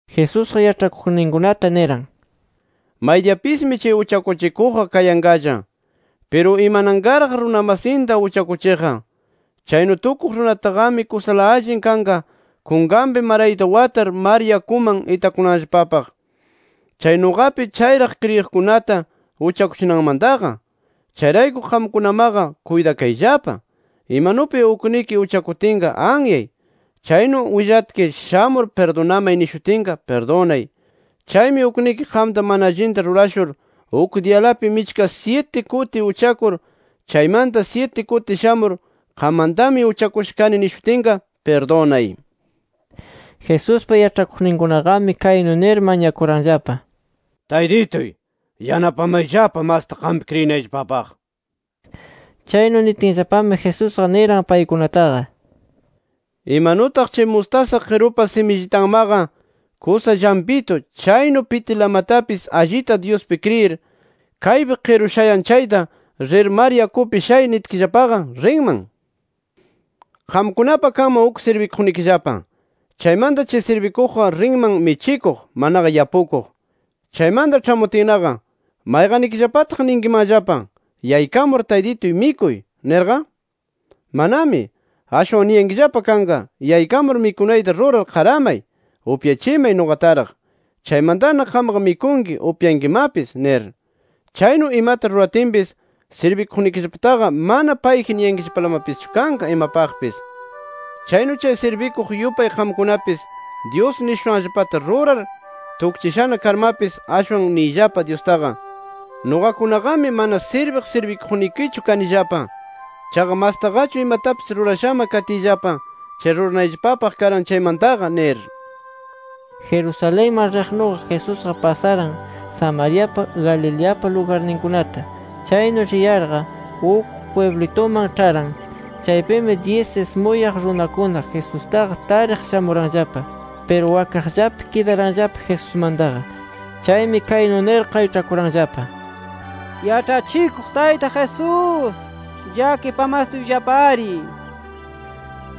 Jesusqa yaĉhakuqninkunata niran: “Maydiyapismi chay uchakuchikuqqa kayanqalla. Piru ¡imananqaraq, runa masinta uchakuchiqqa! Chaynu tukuq runataqami kusala allin kanqa kunkanpi marayta watar mar yakuman itakunanllapapaq, chay nuqapi chayraq kriyiqkunata uchakuchinanmantaqa. Chayrayku qamkunamaqa kuytakayllapa. Imanupi ukniki uchakutinqa, anyay. Chaynu willatki, shamur pirdunamay nishutinqa, pirdunay. Chaymi ukniki qamta mana allinta rurashur uk diyalapi michka syiti kuti uchakur, chaymanta syiti kuti shamur qammantami uchakusha kani nishutinqa, pirdunay”. Jesuspa yaĉhakuqninkunaqami, kaynu nir mañakuranllapa: —Taytituy, yanapamayllapa masta qampi kriyinayllapapaq. Chaynu nitinllapami, Jesusqa niran paykunataqa: —Imanutaq chay mustasa qirupa simillitanmaqa kusa llampitu, chaynu pitilamatapis allita Dyuspi kriyir, kaypi qiru shayan chayta ‘Rir mar yakupi shay’ nitkillapaqa, rinman. “Qamkunapa kanman uk sirbikuqnikillapa. Chaymanta chay sirbikuqqa rinman michikuq manaqa yapukuq. Chaymanta ĉhamutinnaqa ¿mayqannikillapataq ninkimanllapa: ‘Yaykamur taytituy mikuy’ nirqa? ¡Manami! Ashwan niyankillapa kanqa: ‘Yaykamur mikunayta rurar qaramay, upyachimay nuqataraq. Chaymantana qamqa mikunki upyankimapis’ nir. Chaynu imata ruratinpis, sirbikuqnikillapataqa mana ‘Payji’ niyankillapalamapischu kanqa imapaqpis. “Chaynu chay sirbikuq yupay qamkunapis, Dyus nishushanllapata rurar tukchishana karmapis, ashwan niyllapa Dyustaqa: ‘Nuqakunaqami, mana sirbiq sirbikuqnikichu kanillapa. Chaqa mastaqachu imatapis rurashama katiyllapa, chay ruranayllapapaq karan chaymantaqa’ nir”. Jerusalenman riqnuqa Jesusqa pasaran Samariapa, Galileapa lugarninkunata. Chaynu riyarqa uk pwiblituman ĉharan. Chaypimi, dyis ismuyaq runakuna Jesustaqa tariq shamuranllapa. Piru wakaqllapi kidaranllapa Jesusmantaqa. Chaymi kaynu nir qayĉhakuranllapa: —¡Yaĉhachikuq Tayta Jesús, llakipamastuyllapari! nir.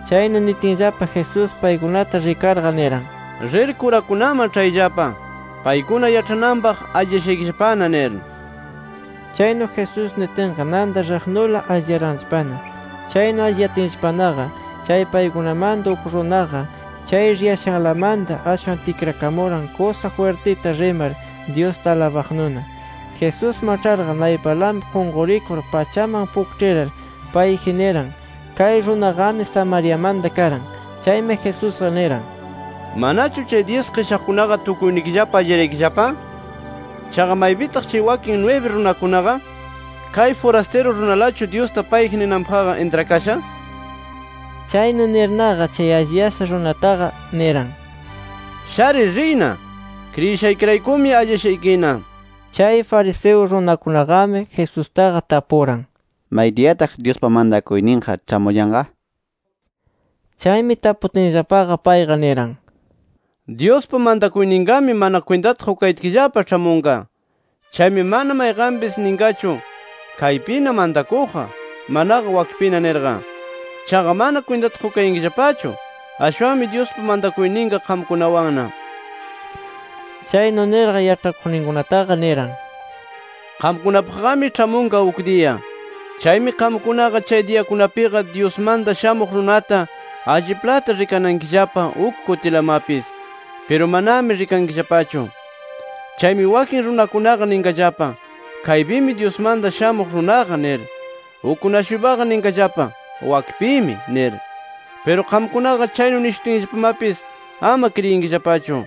Chaynu nitinllapa, Jesús paykunata rikarqa, niran: —Rir kurakunaman ĉhayllapa, paykuna yaĉhananpaq alliyashaykillapana nir. Chaynu Jesús nitinqa, nanta riqnula alliyaranllapana. Chaynu alliyatinllapanaqa, chay paykunamanta uk runaqa, chay riyashanlamanta ashwan tikrakamuran kusa jwirtita rimar Dyusta alabaqnuna. Jesusman ĉharqa, naypanlapi qunqurikur pachaman pukĉhirar payji niran. Kay runaqami Samariamanta karan. Chaymi Jesusqa niran: —¿Manachu chay dyis qishaqkunaqa tukuynikillapa alliyaraykillapa? ¿Chaqa maypitaq chay wakin nwibi runakunaqa? ¿Kay furastiru runalachu, Dyusta payji ninanpaqqa, intrakasha? Chaynu nirnaqa, chay alliyasha runataqa niran: —Sharir riyna. Kriyishaykiraykumi alliyashaykina, nir. Chay fariseo runakunaqami Jesustaqa tapuran, maydiyashi Dyuspa mantakuyninqa ĉhamuyanqa, nir. Chaymi taputinllapaqa, payqa niran: —Dyuspa mantakuyninqami mana kwintata qukayatkillapa ĉhamunqa. Chaymi mana mayqanpis ninqachu: ‘Kaypina mantakuqqa’, manaqa ‘Wakpina’ nirqa. Chaqa mana kwintata qukayankillapachu. Ashwanmi, Dyuspa mantakuyninqa qamkunawanna. Chaynu nirqa, yaĉhakuqninkunataqa, niran: “Qamkunapaqqami ĉhamunqa uk diya. Chaymi qamkunaqa chay diyakunapiqa Dyusmanta Shamuq Runata alliplata rikanankillapa uk kutilamapis. Piru manami rikankillapachu. Chaymi wakin runakunaqa ninqallapa: ‘Kaypimi Dyusmanta Shamuq Runaqa’ nir. Ukkuna-shuypaqa ninqallapa: ‘Wakpimi’ nir. Piru qamkunaqa chaynu nishutinllapamapis, ama kriyinkillapachu.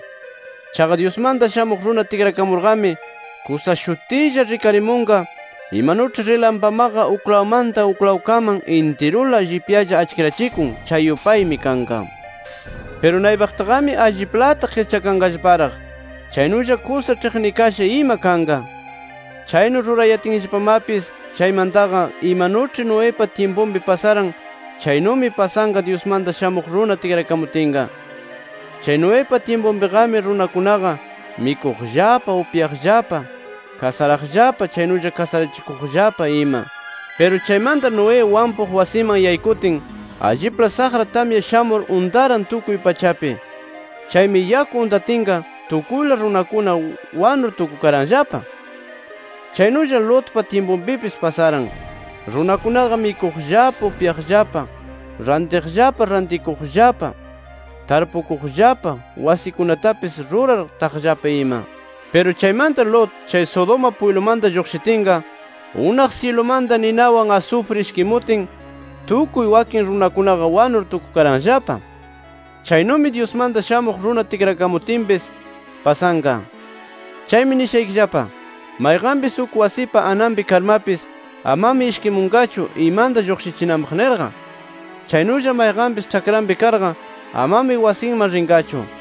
Chaqa Dyusmanta Shamuq Runa tikrakamurqami, kusa shutilla rikarimunqa, imanuĉhi rilampamaqa uklawmanta uklawkaman intirula llipyalla achkirachikun, chay yupaymi kanqa. Piru naypaqtaqami alliplata qischanqallaparaq. Chaynulla kusa ĉhiqnikasha ima kanqa. “Chaynu rurayatinllapamapis chaymantaqa, imanuĉhi Noepa tyimpunpi pasaran, chaynumi pasanqa Dyusmanta Shamuq Runa tikrakamutinqa. Chay Noepa tyimpunpiqami runakunaqa mikuqllapa, upyaqllapa, kasaraqllapa chaynulla kasarachikuqllapa ima. Piru chaymanta Noé wampuq wasiman yaykutin, allipla saqra tamya shamur untaran tukuy pachapi. Chaymi yaku untatinqa, tukuyla runakuna wanur tukukaranllapa. Chaynulla Lotpa tyimpunpipis pasaran. Runakunaqa mikuqllapa, upyaqllapa, rantiqllapa, rantikuqllapa, tarpukuqllapa, wasikunatapis rurar taqllapa ima. Piru chaymanta Lot chay Sodoma pwiblumanta lluqshitinqa, unaq syilumanta ninawan asufri ishkimutin, tukuy wakin runakunaqa wanur tukukaranllapa. Chaynumi Dyusmanta Shamuq Runa tikrakamutinpis pasanqa. “Chaymi nishaykillapa: Mayqanpis uk wasipa ananpi karmapis amami ishkimunqachu, imanta lluqshichinanpaq nirqa. Chaynulla, mayqanpis ĉhakranpi karqa amami wasinman rinqachu.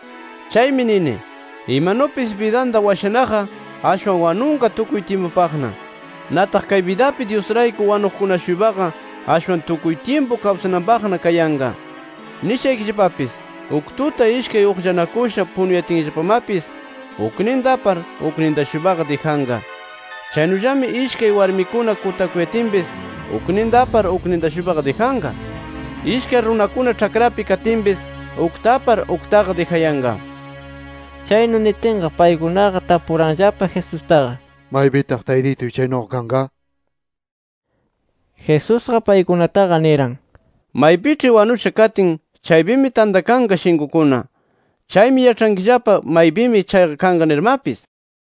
Chaymi nini, imanupis bidanta washanaqqa, ashwan wanunqa tukuy tyimpupaqna. Nataq kay bidapi Dyusrayku wanuqkuna-shuypaqa, ashwan tukuy tyimpu kawsananpaqna kayanqa. “Nishaykillapapis: Uk tuta ishkay uqllanakusha punuyatinllapamapis, ukninta apar, ukninta-shuypaqa dijanqa. Chaynullami ishkay warmikuna kutakuyatinpis, ukninta apar, ukninta-shuypaqa dijanqa. [Ishkay runakuna ĉhakrapi katinpis, ukta apar, uktaqa dijayanqa]”. Chaynu nitinqa, paykunaqa tapuranllapa Jesustaqa: —¿Maypitaq Taytituy chaynuqa kanqa? nir. Jesusqa paykunataqa, niran: —Maypiĉhi wanusha katin, chaypimi tantakanqa shinkukuna. Chaymi yaĉhankillapa maypimi chayqa kanqa nirmapis.